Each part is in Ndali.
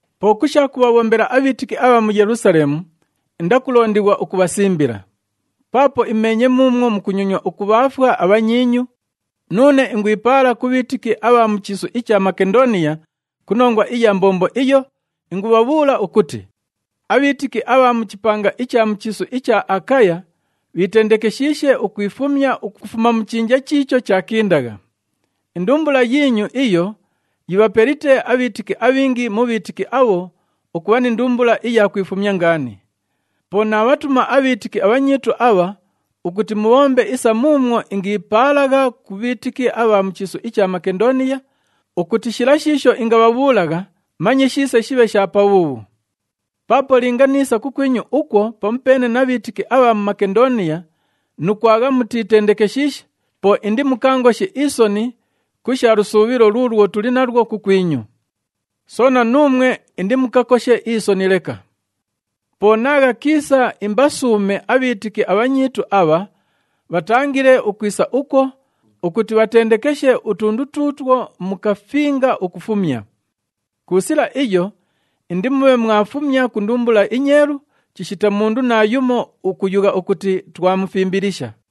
Po ku sha kubhabhombela abhiitiki abha mu Yelusaleemu, indakulondighwa ukubhasimbila. Paapo imeenye muumwo mukunyonywa ukubhaafwa abhanyiinyu, nuune ingwipaala ku bhiitiki abha mu chiisu icha Makendooniya ku nongwa iya mbombo iyo, ingubhabhuula ukuti, “Abhiitiki abha mu chipanga icha mu chiisu icha Akaya bhiitendekeshiishe ukwifumya ukufuma mu chinja chiicho chaakindagha.” Indumbula yiinyu iyo yibhapelite abhiitiki abhingi mu bhiitiki abho ukubha ni ndumbula iya kwifumya ngaani. Po naabhatuma abhiitiki abhanyiitu abha ukuti mubhombe isa muumwo ingiipaalagha ku bhiitiki abha mu chiisu icha Makendooniya, ukuti shila shiisho ingabhabhuulagha manye shiise shibhe sha pabhuubhu. Paapo linga niisa kukwinyu ukwo pamupeene na bhiitiki abha mu Makendooniya nu kwagha mutiitendekeshiishe, po indimukaangoshe isoni ku sha lusuubhilo luulwo tuli nalwo kukwinyu. Soona, nuumwe indimukakoshe isoni leka. Po naagha kiisa imbasuume abhiitiki abhanyiitu abha, bhatangile ukwisa ukwo ukuti bhatendekeshe utundu tuutwo mukafinga ukufumya. Ku sila iyo indimubhe mwafumya ku ndumbula inyeelu chishita mundu naayumo ukuyugha ukuti twamufimbilisha.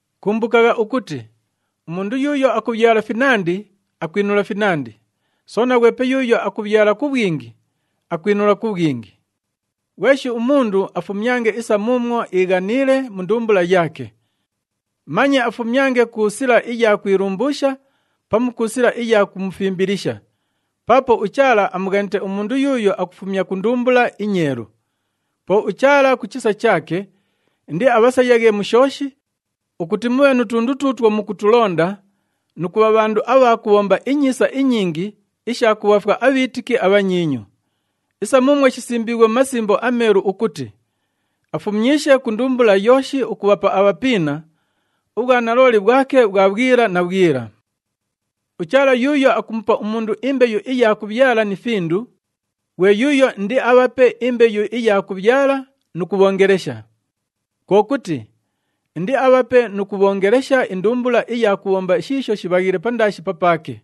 Kumbukagha ukuti, “Umundu yuuyo akubhyala finandi, akwinula finandi, soona ghwepe yuuyo akubhyala ku bhwingi, akwinula ku bhwingi.” Ghweshi umundu afumyange isa muumwo iighaniile mu ndumbula yaake. Manye afumyange ku sila iya kwilumbuusha pamu ku sila iya kumufimbilisha, paapo uChaala amughanite umundu yuuyo akufumya ku ndumbula inyeelu. Po uChaala ku chisa chaake indiabhasayaghe mu shooshi, ukuti mubhe nu tundu tuutwo mukutulonda, nu kubha bhandu abha kubhomba inyiisa inyingi isha kubhaafwa abhiitiki abhanyiinyu. Isa muumwo shisimbiighwe mu Masimbo aMeelu ukuti, “Afumyishe ku ndumbula yooshi ukubhapa abhapiina, ubhwanalooli bhwake bhwa bhwila na bhwila.” UChaala yuuyo akumupa umundu imbeyu iya kubhyala ni findu, ghwe yuuyo indiabhape imbeyu iya kubhyala nu kubhoongelesha. Kwo kuti, indiabhape nu kubhoongelesha indumbula iya kubhomba shiisho shibhaghiile pandaashi papaake.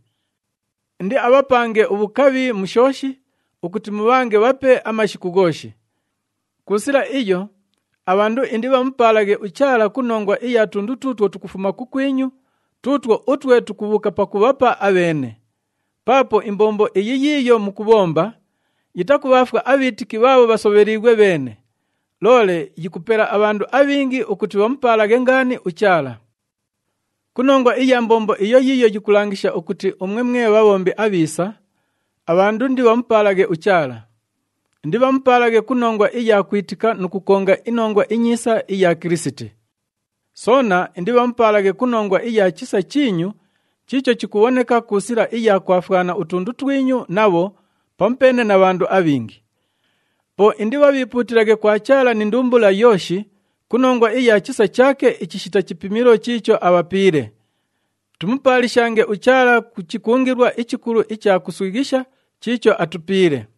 Indiabhapange ubhukabhi mu shooshi ukuti mubhange bhape amashiku ghooshi. Ku sila iyo, abhandu indibhamupaalaghe uChaala ku nongwa iya tundu tuutwo tukufuma kukwinyu, tuutwo utwe tukubhuuka pakubhapa abheene. Paapo imbombo iyi yiiyo mukubhomba, yitakubhaafwa abhiitiki bhaabho bhasobheliighwe bheene, loole yikupela abhandu abhingi ukuti bhamupaalaghe ngaani uChaala. Ku nongwa iya mbombo iyo yiiyo yikulangisha ukuti umwe mwe bhabhombi abhiisa, abhandu indibhamupaalaghe uChaala. Indibhamupaalaghe ku nongwa iya kwitika nu kukonga iNongwa iNyiisa iya Kilisiti. Soona indibhamupaalaghe ku nongwa iya chisa chiinyu chiicho chikubhoneka ku sila iya kwafwana utundu twinyu nabho pamupeene na bhandu abhingi. Po indibhabhiipuutilaghe kwa Chaala ni ndumbula yooshi ku nongwa iya chisa chaake ichishita chipimilo chiicho abhapiile. Tumupaalishange uChaala ku chikungilwa ichikulu icha kuswighisha chiicho atupiile.